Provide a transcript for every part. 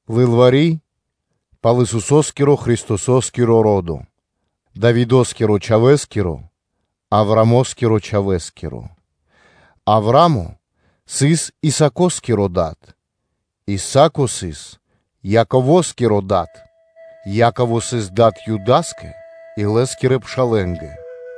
Лылвари́ (книга) пал Исусо́скиро Христосо́скиро ро́до, Давидо́скирэ Чхавэ́скиро, Аврамоскирэ Чхавэ́скиро. Авра́мо сыс Исако́скиро дад, Исако сыс Яково́скиро дад, Яково сыс дад Юда́скэ и лэ́скирэ пшалэ́нгэ;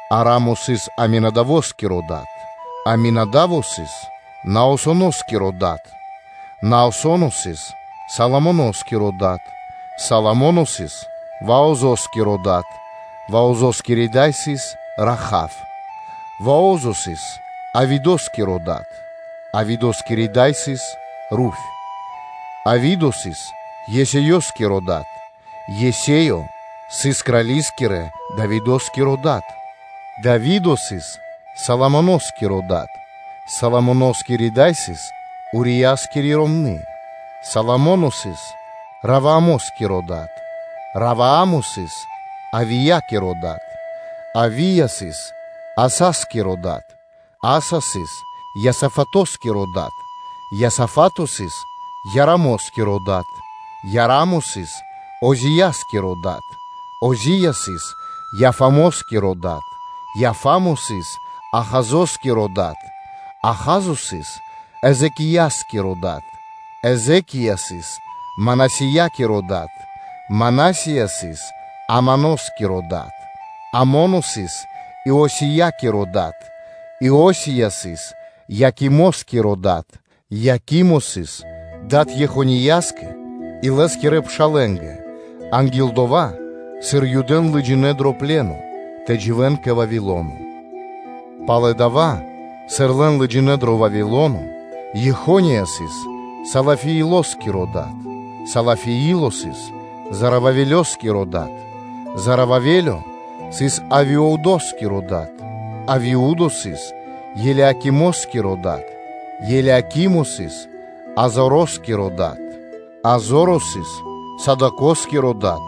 Ара́мо сыс Аминадаво́скиро дад, Аминада́во сыс Наасоно́скиро дад, Наасо́но сыс Салмоно́скиро дад; Салмо́но сыс Ваозо́скиро дад (Ваозо́скири дай сыс Раха́в), Вао́зо сыс Авидо́скиро дад (Авидо́скири дай сыс Руфь); Авидо сыс Есеёскиро дад, Есеё сыс крали́скирэ – Давидо́скиро Дад; Дави́до сыс Соломоно́скиро дад (Соломоно́скири дай сыс Урия́скири ромны́); Соломо́но сыс Ровоамо́скиро дад, Ровоа́мо сыс Авия́киро дад, Авия́ сыс Аса́скиро дад; Аса́ сыс Иосафато́скиро дад, Иосафа́то сыс Иорамо́скиро дад, Иора́мо сыс Ози́яскиро дад; Ози́я сыс Иофамо́скиро дад, Иофа́мо сыс Ахазо́скиро дад, Аха́зо сыс Езэкия́скиро дад; Езэки́я сыс Манасия́скиро дад, Мана́сия сыс Амоно́скиро дад, Амоно сыс Иосия́скиро дад; Иосия сыс Иокимоскиро дад, Иокимо сыс дад Ехонияскэ и лэ́скирэ пшалэ́нгэ анги́л дова́, сыр Юдэ́н лыджинэ́ дро пле́но (пэ зор) тэ дживэ́н кэ Вавило́но. Пало́ дава́, сыр лэн лыджинэ́ дро Вавило́но, Ехония сыс Салафиилоскиро дад; Салафиило сыс Зоровавелёскиро дад; Зороваве́лё сыс Авиудоскиро дад, Авиудо сыс Елиакимоскиро дад, Елиакимо сыс Азороскиро дад; Азоро сыс Садокоскиро дад,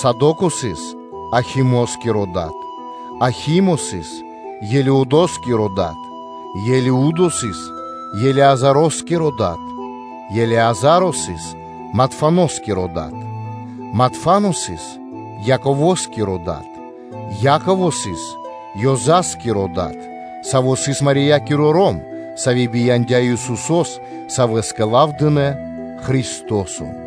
Садоко сыс Ахимоскиро дад, Ахимо сыс Елиудоскиро дад; Елиудо сыс Елеазароскиро дад, Елеазаро сыс Матфаноскиро дад, Матфано сыс Яково́скиро дад; Яково сыс Иосифоскиро (Ёзаскиро) дад, саво́ сыс Мариякиро ром, сави́ бияндя́ Исусо́с, Савэ́скэ лав дынэ́ Христо́со.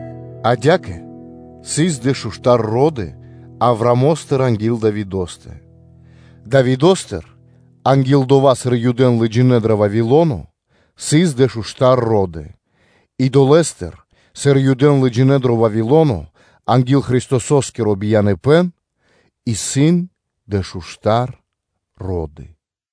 Адя́кэ сыс дэшуштар ро́ды Аврамостыр анги́л Давидо́стэ; Давидостыр анги́л дова́, сыр Юдэ́н лыджинэ́ дро Вавило́но исын дэшуштар ро́ды; и долэ́ дывэсэ́ндыр, сыр Юдэ́н лыджинэ́ дро Вавило́но анги́л Христосо́скиро бияныпэ́н исын дэшуштар ро́ды.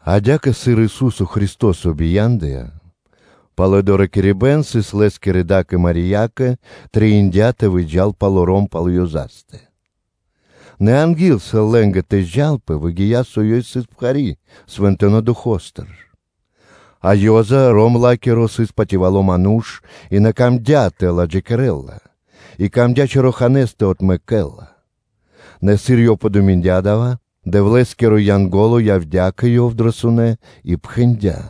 Адя́кэ, сыр Ису́со Христо́со Дро Юды́тко оригина́ло “Ешуа́ -ха-машиах” бия́ндыя: пало́ (после) доракирибэ́н тэ лэнпэ, сыр Лэ́скирэ да́кэ Мариякэ трэиндя́ тэ выджа́л палоро́м пал Ёзастэ, нэ анги́л, сыр лэ́нгэ тэ зджанпэ (тэ лэнпэ), выгия́, со Ёй сыс пхари́ Свэнтонэ́ Духо́стыр (Фаностыр). А Ёза (Иосифо), ром Ла́киро, сыс патывало ману́ш и на камдя́ тэ ладжакирэл Ла, и камдя́ чораханэ́с тэ отмэкэ́л Ла. Нэ сыр ёв подуминдя дава́, Дэвлэ́скиро Янго́ло явдя́ кэ ёв дрэ сунэ́ и пхэндя́: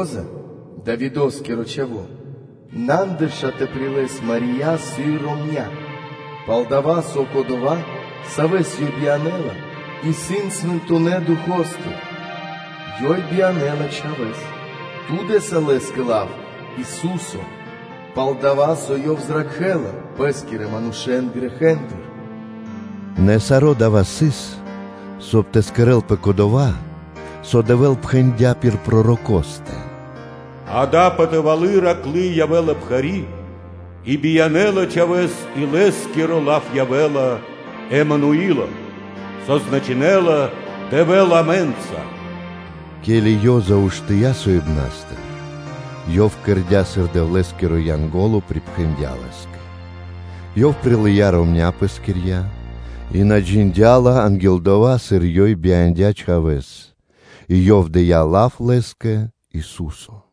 “Ёзэ, Давидо́скиро чхаво́, на андырша тэ прилэс Мари́я сыр ромня́, пал-дова́ со Кодова́, Савэс ёй биянэ́ла, исын Свэнтонэ́ Духо́стыр (Фаностыр); ёй биянэ́ла Чхавэ́с, ту дэ́са Лэ́скэ лав Ису́со, пал-дова́ со Ёв зракхэ́ла Пэ́скирэ манушэ́н грэхэ́ндыр.” Нэ саро́ дава́ сыс, соб (кай) тэ кэрэ́лпэ дова́, со Дэвэ́л пхэндя́ пир пророкостэ: “Акэ, патывалы́ тэрны́ джувлы́ явэ́ла пхари́, и биянэ́ла Чхавэ́с, и Лэ́скиро лав явэ́ла Эмануило” (со значынэ́ла: “Дэвэ́л исын амэ́нца”). Ке́ли Ёза уштыя́ соибнастыр, ёв кэрдя́, сыр Дэвлэ́скиро Янго́ло (А́нгело) припхэндя́ лэ́скэ; ёв прилыя́ ромня́ пэскирья́, и ёв на джиндя́ Ла сыр ромня́, анги́л дова́, сыр Ёй бияндя́ Чхавэ́с; и ёв дыя́ лав Лэ́скэ Ису́со.